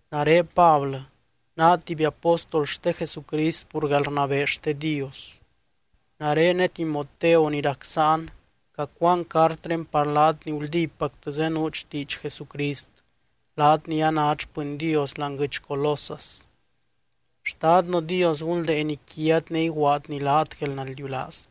Nare Pablɨ, naa tuby apóstol xte Jesucrist pur guelrnabee xte Dios. Nare ne Timoteo ni rac sáan cacuaan cartré par laat ni guldípactɨ zenuut xtiidx Jesucrist, laat ni anát xpɨny Dios láani guɨdx Colosas. Xtadnɨ Dios gunldeeny quiat ne iguaadny laat guelnaldiulaaz.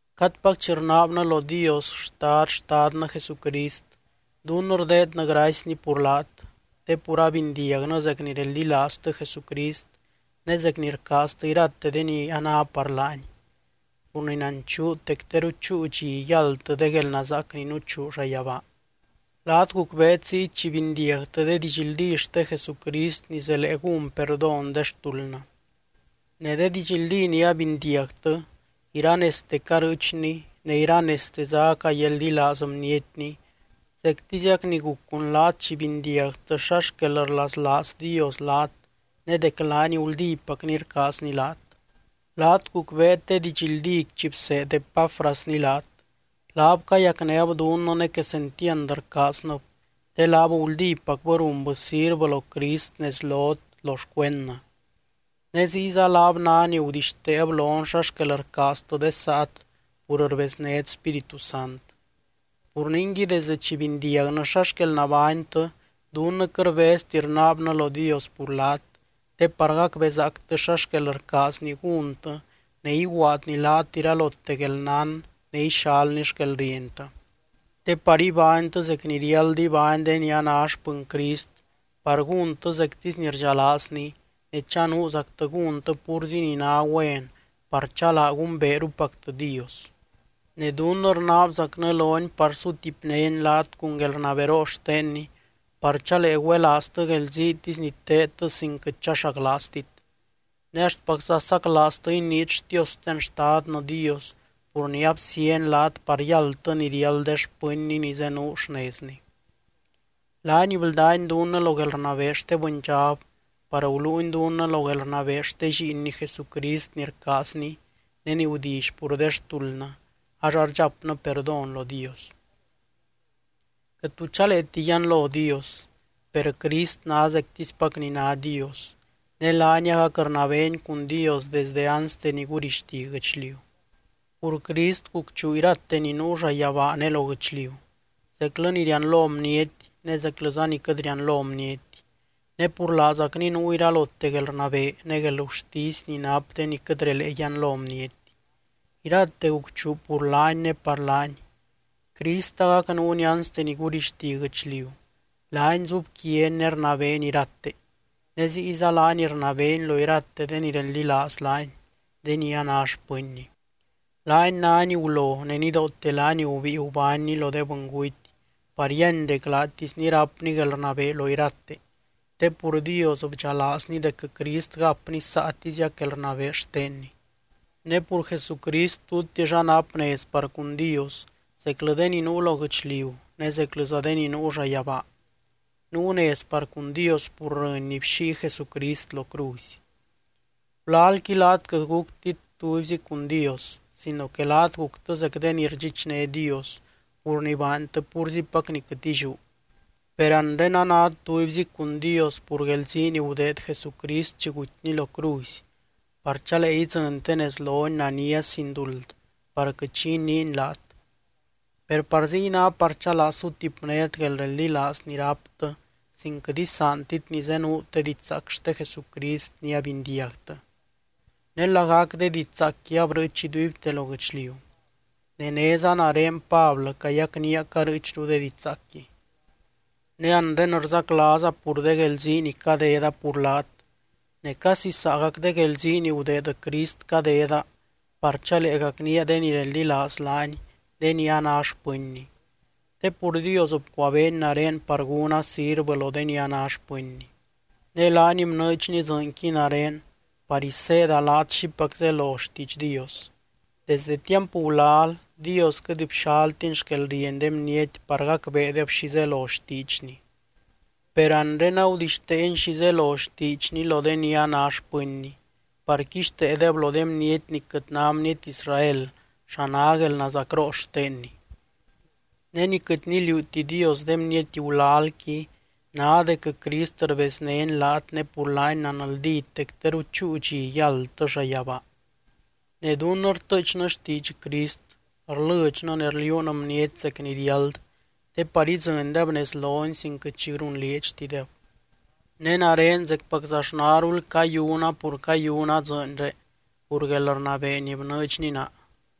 Cadpac chi rnaabnɨ lo Dios Xtad Xtadnɨ Jesucrist, dunnɨ rdeednɨ gracyny pur laat. Te pur abindiagnɨ zec ni reldilaaztɨ Jesucrist ne zec ni rcaaztɨ irate de ni a ná par laany. Pur ni nanchuut dec teru chúu dxi yáldtɨ de guelnazaac ni nuchuu llayabaa. Laat gucbeet ziy chi bindiagtɨ de didxldí xte Jesucrist ni zelee gún perdón de xtuldnɨ. Ne de didxldí ni abindiagtɨ, iranezte carɨɨchni ne iranezteza acayeldilaaz bnietni zectiziac ni guc cun laat chi bindiagtɨ xa xquel rlaslaaz Dios laat ne dec laany guldípacny rcaazny laat. Laat gucbeet de didxldíqui chi bseed Epáfrasni laat. Laab cayacnéb dunnɨ ne quesentiand rcaaznɨb, te laab guldípacbɨ runbɨ sirvɨ lo Crist nez lot lo xcuendnɨ. Ne ziyza laab ná ni gudixteeb lon xa xquel rcaaztɨ de saat pur rbeznét Spíritu Sant. Pur ningui, desdɨ chi bindiagnɨ xa xquel nabánytɨ, dunnɨ quɨt rbezti rnaabnɨ lo Dios pur laat, te par gacbezaactɨ xa xquel rcaazny gúntɨ ne iguaadny laat iralote guelnán ne ixalny xquelrientɨ. Te par ibánytɨ zec ni riáld ibány de ni a ná xpɨny Crist par gúntɨ zectisy ni rdxalaazny ne chanuuzactɨ gúntɨ púrzi ni ná güen par chalaa gumbeerupactɨ Dios. Ne dunnɨ rnaabzacnɨ lony par sutipnény laat cun guelrnaberoo xtenny par chalee güelaaztɨ guelziitisy ni teedtɨ sin quɨt chaxaclaaztit. Ne axtpacza saclaaztɨ iniit xtiosten Xtadnɨ Dios pur ni absíany laat par yáldtɨ ni riáld de xpɨnny ni zenuu xnezny. Laany bldány dunnɨ lo guelrnabee xte bɨndxab par guluuny dunnɨ lo guelrnabee xte Lliinny Jesucrist ni rcaazny ne ni gudilly pur de xtuldnɨ ax ardxapnɨ perdón lo Dios. Quɨt tu chaleeti yianlo Dios. Per Crist ná zectispac ni ná Dios ne laany agac rnabeeny cun Dios desde anste ni gurixti guɨchliu. Pur Crist, gucchuu irate ni nuu llayabaa ne lo guɨchliu, zeclɨ ni rianlo bniety ne zeclɨza ni quɨt rianlo bniety. Ne pur laazacny nuu iralote guelrnabee, ne guelgurtisy ni nap de ni quɨt relee yianlo bniety. Irate gucchuu pur laany ne par laany. Crist agac nuuny anste ni gurixti guɨchliu, laany zubquiany ne rnabeeny irate. Ne ziyza laany rnabeeny lo irate de ni reldilaaz laany, de ni a ná xpɨnny. Laany nány gulo, ne nidoote laany gubíi gubánny lo de bɨnguty par yíany dec laatisny rápny guelrnabee lo irate te pur Dios bdxalaazny dec Crist gapny saatiziac guelrnabee xtenny. Ne pur Jesucrist tutix anap nez par cun Dios, zeclɨ de ni nuu lo guɨchliu ne zeclɨza de ni nuu llayabaa. Nuu nez par cun Dios pur rɨny ni bxíi Jesucrist lo cruzy. Gulalqui laat quɨt guctit tubyzi cun Dios sino que laat guctɨ zec de ni rdxichné Dios pur ni baantɨ púrzipac ni quɨt illiú. Per anre anát tubyzi cun Dios pur guelzii ni gudeed Jesucrist chi gutyny lo cruzy, par chalee idzɨntɨ nez lony nania sin duld par quɨt xi iniiny laat. Per par ziy ná par chalaa sutipnét guelreldilaaz ni ráptɨ sin quɨt isaantit ni zenuut de didxzaac xte Jesucrist ni abindiagtɨ. Ne lagac de didxzaacqui abrɨɨch iduibte lo guɨchliu. Ne néza nare Pablɨ cayacnía carɨɨchru de didxzaacqui. Ne anre rzaclaaza pur de guelzii ni cadeda pur laat ne casi saagac de guelzii ni gudeed Crist cadeda par chalee gacnía de ni reldilaaz laany de ni a ná xpɨnny. Te pur Dios bcuabeeny nare par gúna sirvɨ lo de ni a ná xpɨnny. Ne laany bnɨɨdxny dzɨɨnqui nare par iseeda laat xipac zelo xtiidx Dios. Desde tiamp gulal, Dios quɨt bxaltiny xquelrieny de bniety par gacbeedeb xi zelo xtiidxny. Per anre, agudixteeny xi zelo xtiidxny lo de ni a ná xpɨnny, par quixteedeb lo de bniety ni quɨt ná bniety Israel xa ná guelnazacroo xtenny. Ne ni quɨt niliuuti Dios de bniety gulalqui ná dec Crist rbeznény laat ne pur laany nanldít dec teru chúu dxi yáldtɨ llayabaa. Ne dunnɨ rtɨɨchnɨ xtiidx Crist, rlɨdxnɨ ne rliuun bniety zec ni riáld te par idzɨndeb nez lony sin quɨt xi runlieedxtideb. Ne nare zecpaczaxnarul cayuna pur cayuna dzɨɨnré pur guelrnabee ni bnɨɨdxny naa.